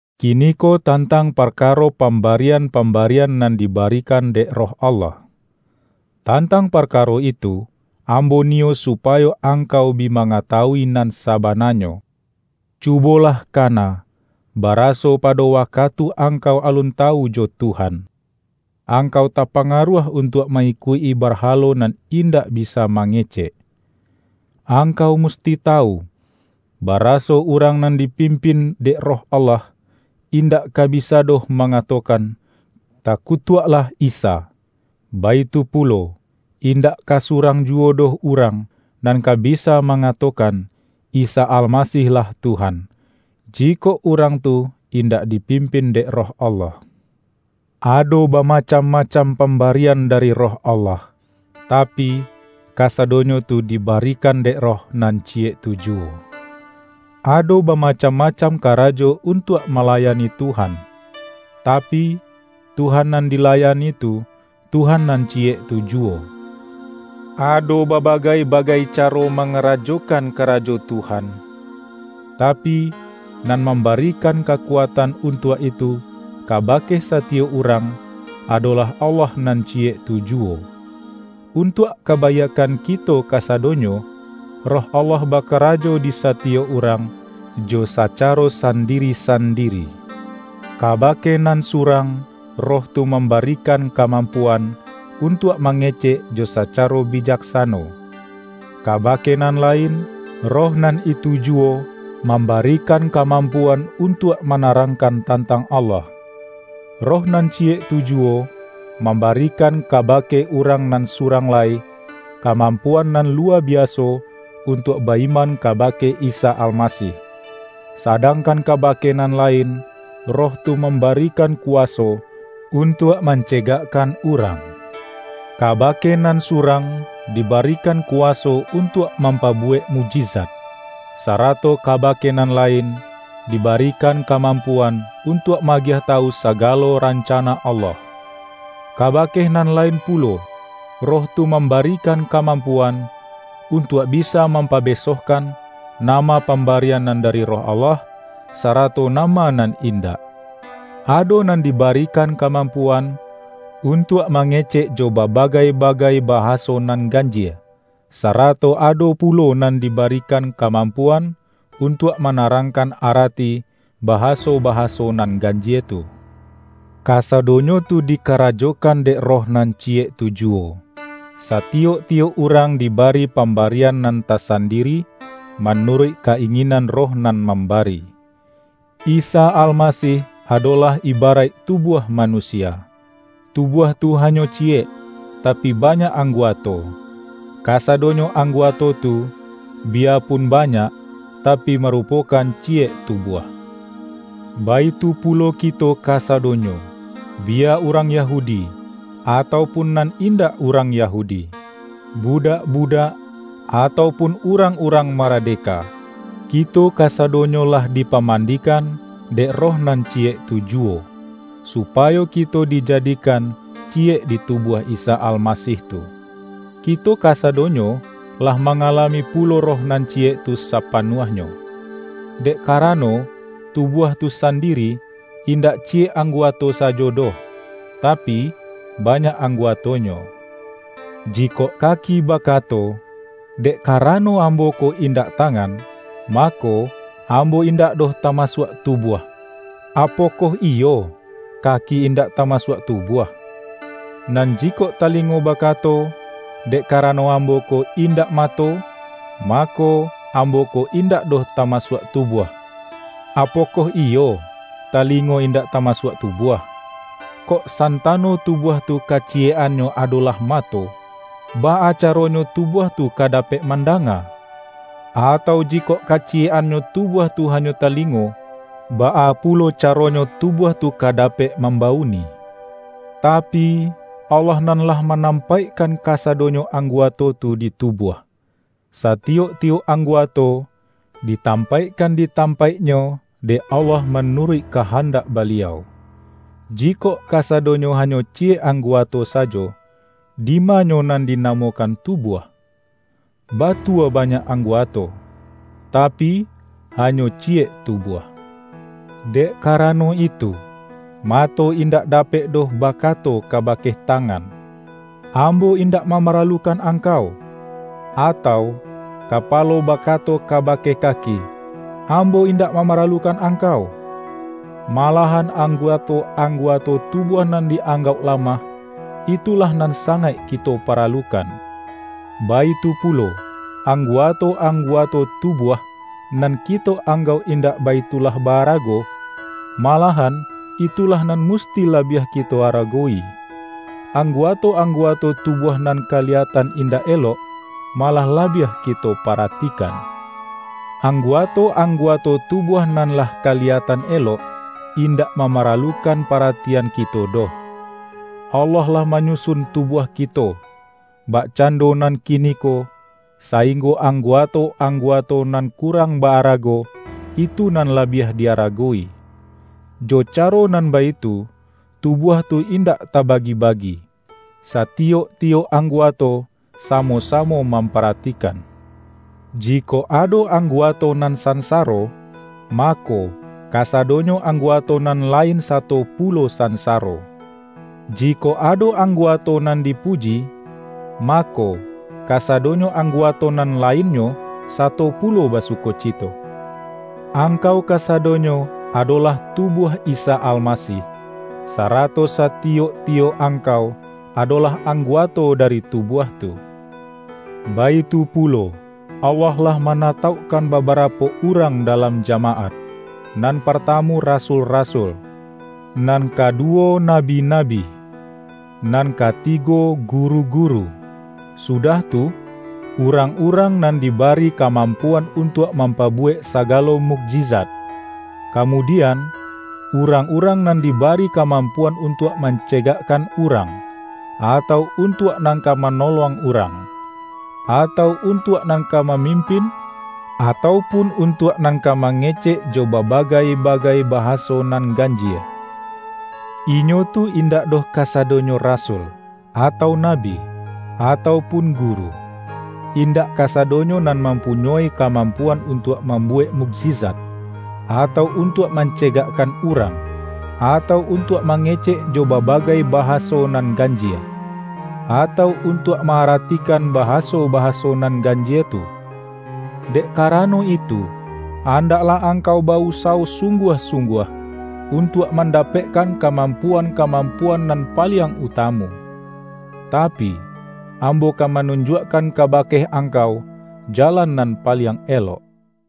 Kiniko tantang parkaro pam-barian-pambarian nan diba-rikan dek Roh Allah. Tantang parka-ro itu, ambo niyo supayo angkau bi mangatawui nan sabananyo. Cubo-lah kana, baraso pado wakatu angkau alun tawu jo Tuhan, angkau tapanga-ruah untuak ma-ikuik-i barhalo nan indak bisa mangecek. Angkau musti tawu, baraso urang nan dipimpin dek Roh Allah, indak ka bisa doh manga-tokan,”Takutuaklah Isa!” Baitu pu-lo, indak ka surang juwo doh urang, nan ka bisa mangatokan,”Isa Alma-sih-lah Tuhan!” jikok urang tu indak dipimpin dek Roh Allah. Ado bamacam-macam pambarian dari Roh Allah, tapi, kasadonyo tu di-barikan dek Roh nan Ciyek tu juwo. Ado bamacam-macam karajo untuak malayani Tuhan, tapi, Tuhan nan di-layani tu, Tuhan nan Ciyek tu juwo! Ado babagai-bagai caro mangarajo-kan karajo Tuhan, tapi, nan mambari-kan kakuatan untuak itu kabake sati-yok urang, adolah Allah nan Ciyek tu juwo. Untuak kabaiakkan kito kasa-donyo, Roh Allah bakarajo di satiyok urang, jo sacaro sandiri-sandiri. Ka-bake nan surang, Roh tu mambarikan kamampuan, untuak mangecek jo sa-caro bijaksano. Kabake nan lain, Roh nan itu juwo, mambarikan kamam-puan untuak manarangkan tantang Allah. Roh nan Ciyek tu juwo, mam-barikan kabake urang nan surang lai, kamampuan nan luwa biaso untuak ba-iman kabake Isa Almasih; sadangkan kabake nan lain, Roh tu mambarikan kuwaso, untuak mancegakkan urang. Kabake nan surang, dibarikan ku-waso untuak mampabuwek mukjizat, sarato kabake nan lain, dibarikan ka-mampuan untuak ma-agiah tawu saga-lo rancana Allah. Kabake nan lain pu-lo, Roh tu mambarikan kamampuan, untuak bisa mampabesohkan, nama pambarian nan dari Roh Allah, sarato nama nan indak. Ado nan dibarikan kamampuan, untuak mangecek jo ba-bagai-bagai bahaso nan ganjie, sarato ado pulo nan dibarikan kamampuan, untuak manarangkan arati, bahaso-bahaso nan ganjie tu. Kasadonyo tu dikarajokan dek Roh nan Ciyek tu juwo; satiyok-tiyok urang dibari pam-barian nan tasandiri, manuruik ka-inginan Roh nan mambari. Isa Almasih adolah ibaraik tubuah manusia; tubuah tu hanyo ciyek, tapi banyak angguato. Kasadonyo angguato tu, biyapun banyak, tapi marupokan ciyek tubuah. Baitu pulo kito kasa-donyo, biya urang Yahudi, atau pun nan indak urang Yahudi, budak-budak, atau pun urang-urang maradeka; kito kasadonyo lah dipamandikan dek Roh nan Ciyek tu juwo, supayo kito dijadi-kan Ciyek di tubuah Isa Almasih tu. Kito kasadonyo, lah mangalami pulo Roh nan Ciyek tu sapanuahnyo. Dek karano, tubuah tu sandiri, indak Ciyek angguato sajo doh, tapi, banyak angguatonyo. Jikok kaki bakato,”Dek karano ambo ko indak tangan, mako, ambo indak doh tama-suak tubuah.” Apokoh iyo, kaki indak tamasuak tubuah? Nan jikok tali-ngo bakato,”Dek karano ambo ko in-dak mato, mako, ambo ko indak doh tamasuak tubuah.” Apokoh iyo, tali-ngo indak tamasuak tubuah? Kok santano tubuah tu kaciyek-annyo ado-lah mato, baa caronyo tubuah tu ka dapek mandanga? Atau, jikok kaci-yek-annyo tubuah tu hanyo talingo, baa pulo caronyo tubuah tu ka dapek mambauni? Tapi, Allah nan lah ma-nampaikkan kasadonyo angguato tu di tubuah. Satiyok-tiyok angguato, di-tampaikkan di tampaiknyo dek Allah manuruik kahandak Baliau. Jikok kasadonyo hanyo ciyek angguato sa-jo, dimanyo nan dinamokan tubuah? Batua banyak angguato, tapi, ha-nyo ciyek tubuah. Dek karano itu, mato indak da-pek doh bakato kabake tangan,”Am-bo indak mamaralukan angkau!” atau, kapalo bakato kabake kaki,”Ambo indak mamaralukan angkau!” Ma-lahan angguato-angguato tubuah nan di-anggauk lamah, itulah nan sangaik kito paralukan; baitu pulo, anggu-ato-angguato tubuah, nan kito ang-gauk indak baitulah ba-arago, malahan itulah nan musti labiah kito aragowi. Angguato-angguato tubuah nan kali-yatan indak elok, malah labiah kito paratikan. Angguato-angguato tu-buah nan lah kaliyatan elok, indak mamaralukan paratian kito doh. Allah lah manyusun tubuah kito, bakcando nan kiniko, sainggo angguato-anggu-ato nan kurang ba-arago, itu nan la-biah di-aragowi. Jo caro nan baitu, tubuah tu indak tabagi-bagi; satiyok-tiyok angguato samo-samo mampa-ratikan. Jikok ado angguato nan sansaro, mako, kasadonyo angguato nan lain sato pulo sansaro; jikok ado angguato nan dipuji, mako, kasado-nyo angguato nan lainnyo, sato pu-lo basukocito. Angkau kasadonyo adolah tubuah Isa Almasih, sarato satiyok-tiyok ang-kau adolah angguato dari tubuah tu. Baitu pulo, Allah lah manataukkan babarapo urang dalam jamaat: Nan partamu rasul-rasul; nan kaduwo na-bi-nabi, nan katigo guru-guru, sudah tu, urang-urang nan dibari kamampu-an untuak mampabuwek sagalo mukji-zat, kamudian, urang-urang nan diba-ri kamampuan untuak mancegakkan urang, atau untuak nan ka manolong urang, atau untuak nan ka mamim-pin, atau pun untuak nan ka mange-cek jo babagai-bagai bahaso nan ganjie. Inyo tu indak doh kasadonyo rasul, atau nabi, atau pun guru. Indak kasa-donyo nan mampunyoi kamampuan untuak mambuwek mukjizat, atau untuak mancegakkan urang, atau un-tuak mangecek jo babagai bahaso nan ganjie, atau untuak ma-aratikan ba-haso-bahaso nan ganjie tu. Dek ka-rano itu, andaklah angkau ba-usawo sungguah-sungguah, untuak manda-pekkan kamampuan-kamampuan nan paliang utamu. Tapi, ambo ka manunjuakkan kabake angkau, jalan nan paliang elok.